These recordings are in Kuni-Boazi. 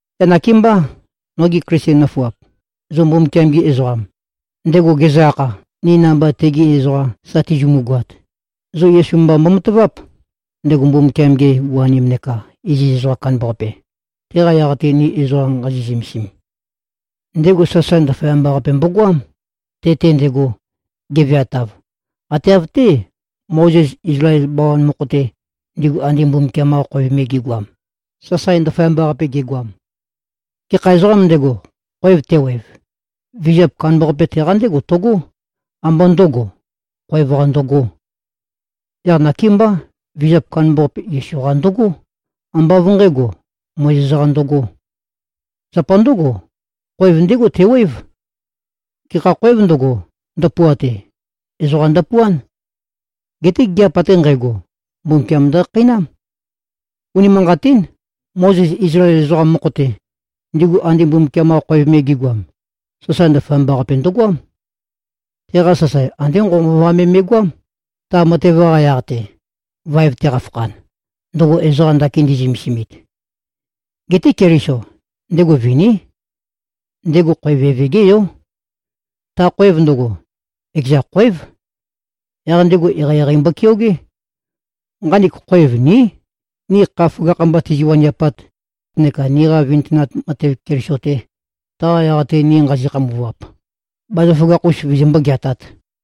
Yaq nakémbá, nogi Klisten nøfuap, zo Mbumbukiam-gi ezoqam, ndego gezø-akha, ni namba tegi ezoqam sa tizimu-goat, zo Yesu mba mbomataváp, ndego Mbumbukiam-ge u-anem neka iziz ezoqam kandambaqape, teqa yaq-te ni ezoqa nqazi꞉-zømesim. Ndego sasae ndaføyamba-qape mbogoám, te-te ndego, geveatav, ate av-té, Mozes Izlael bawan mokho-te, ndigu ande Mbumbukiam-qa khoev me gi꞉goam, sasae ndaføyamba-qape ge꞉goam. Gekha ezoqām ndego, khoev tewev, vizap kandambaqape teqa ndégo tøgó, ambá ndø̄go, khoev-qa ndøgō. Yaq nakémbá, vizap kandambaqape Yesu-qa ndøgó, ambá av nqǣgo, Mozes-qa ndøgō. Zapa ndǿgo, khoev ndégo tewév. Gekha khōev ndøgo, ndøpuate, ezoqa ndøpuán. Geté gigiap ate nqægo, Mbumbukiam ndøkhakheinám. Unimanqatín. Mozes Izlael ezoqam mokho-te, ndigu ande Mbumbukiam-qa khoev me gi꞉goam, sasae ndaføyamba-qape ndøgoám. Teqa sasae andé nqovønqova me me꞉goám, ta matev-qa yaq-te, vaev-te qafakhan, ndøgo ezoqa ndakin ndi꞉zømesimit. Geté Keliso, ndego viní. Ndego khoev Eve-gé Yó. Ta khoev ndøgo, ekeza khoév. Yaq ndego eqeieqei mbokeogé. Nqanek khoev ní, ni kha føgakh-mba tizi-waniapat neka niqa vintønat matev Keliso-te, taqa yaq-te ni nqazi꞉-khambuvap, bazaføgakh-us vizimbó-geatāt.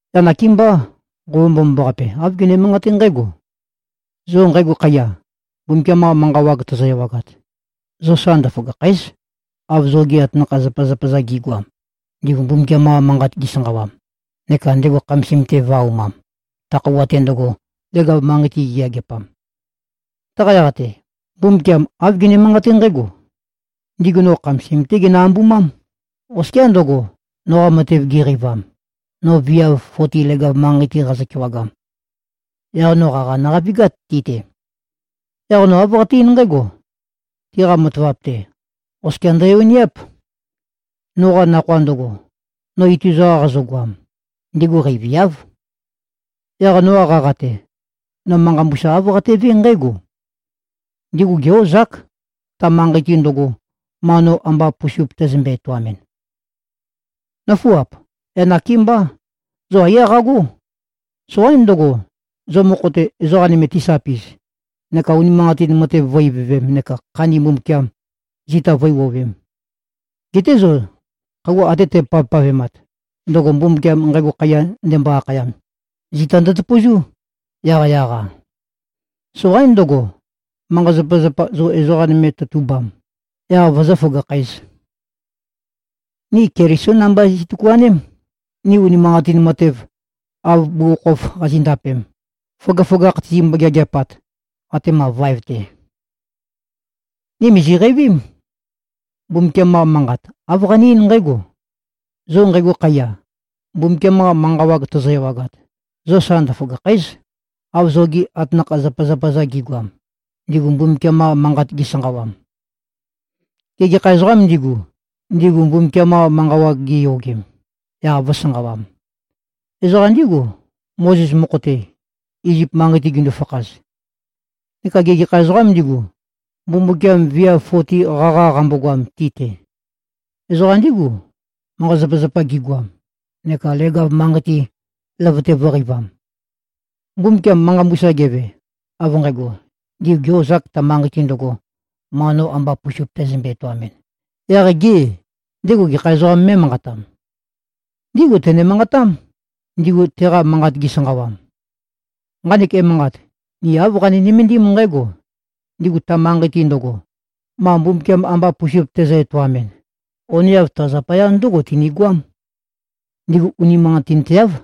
Yaq nakémbá, Nqova Mbomambaqape, āv gene-manqaté nqǽgo, “Zo nqægo khaiya, Mbumbukiam-qa manqa wag tozo-ewagat, zo sa ndøføgàkhæ᷄z, av zogi atanakha-zapazapa-za gi꞉goam, ndigu Mbumbukiam-qa manqat gisanqawam neka ndego khamasim-te vø̄-aumam, ta khøuwa-te ndøgo, leg-av manqei-te giyageapam.” Taqa yaq-te, Mbumbukiam āv gene-manqaté nqǽgo, “Ndigu no khamasim-té ginø-ambumám, oskiá ndøgo, noqa matev giqeivam, no viav foti leg-av manqei-te qazø-kewagam. Yaq no qaqa nøqavigát ti-te. Yaq no āv qate-eín nqǽgo, ‘Tiqa matavap-te, oskia ndøyoniáp. Noqa nakhoa ndøgo, no ituza-qa qazøgoam, ndigu qeiviáv.’ Yaq noqa qaqa-te, no manqa mbusa āv qatevé nqǽgo, ‘Ndigu gé-ozák, ta manqei-te ndøgo, ma no amba pusup tæzømbe-etoamɨn.’” Nǿfuap! Yaq nakémbá, zo aiyá qagó. Soqaín ndøgo, zo mokho-te, ezoqa nøme tisapi꞉z neka unimanqatin matev vǿ-ivøvēm neka khandi Mbumbukiam, zita vǿe-wuowēm. Geté zo khøuwa ate tæpavpavemat, ndøgo Mbumbukiam “Nqægo khaiya” ndembo-akhayam, zita ndøtøpøzú, yaqyaq-a. Soqaín ndøgo, manqa-zapazapa zo ezoqa nøme tøtubam, yaq vozó-føgakhǣz. Ni Kelisó namba zi꞉tøkuaném, ni unimanqatin matev, av bugukhokhof qazi꞉ndapem, føgøføgakh tizimbo-geageapat, atema vaev-te. Ni mìziqeivím. Mbumbukiam-qa Manqat, āv qane-eín nqǽgo, “Zo nqægo khaiya, Mbumbukiam-qa manqa wag tozo-ewagat, zo sa ndøføgàkhæ᷄z, av zogi atanakha-zapazapa-za gi꞉goam, ndigu Mbumbukiam-qa manqat gisanqawam.” Gê, gekha ezoqâm ndigu, ndigu Mbumbukiam-qa manqa wag giyogem, yaq vø̄sanqawam? Ezoqa ndígu, Mozes mokho-te, Izip manqei-te gindu-fakhaz. Neka gê, gekha ezoqâm ndigu, Mbumbukiam viav foti qaqa qambogoam ti-te? Ezoqa ndígu, manqa-zapazapa gigoam, neka leg-av manqei-te, løvøte vø̄qeivam. Mbumbukiam manqa mbusa geve, av nqægo, “Ndigu gē-ozāk, ta manqei-te ndøgo, ma no amba pusup tæzømbe-etoamɨn,” yaq gê, ndego gekha ezoqām mé꞉manqatam? Ndígu tené-manqatam, ndigu teqa manqat gisanqawam. Nqanek emanqat, ni āv qani-nømendím nqǽgo: Ndigu ta manqei-te ndøgo, ma Mbumbukiam amba pusup tezø-etaomɨn, oneav ta zapaya ndǿgo tinigøám: Ndigu unimanqatinteáv.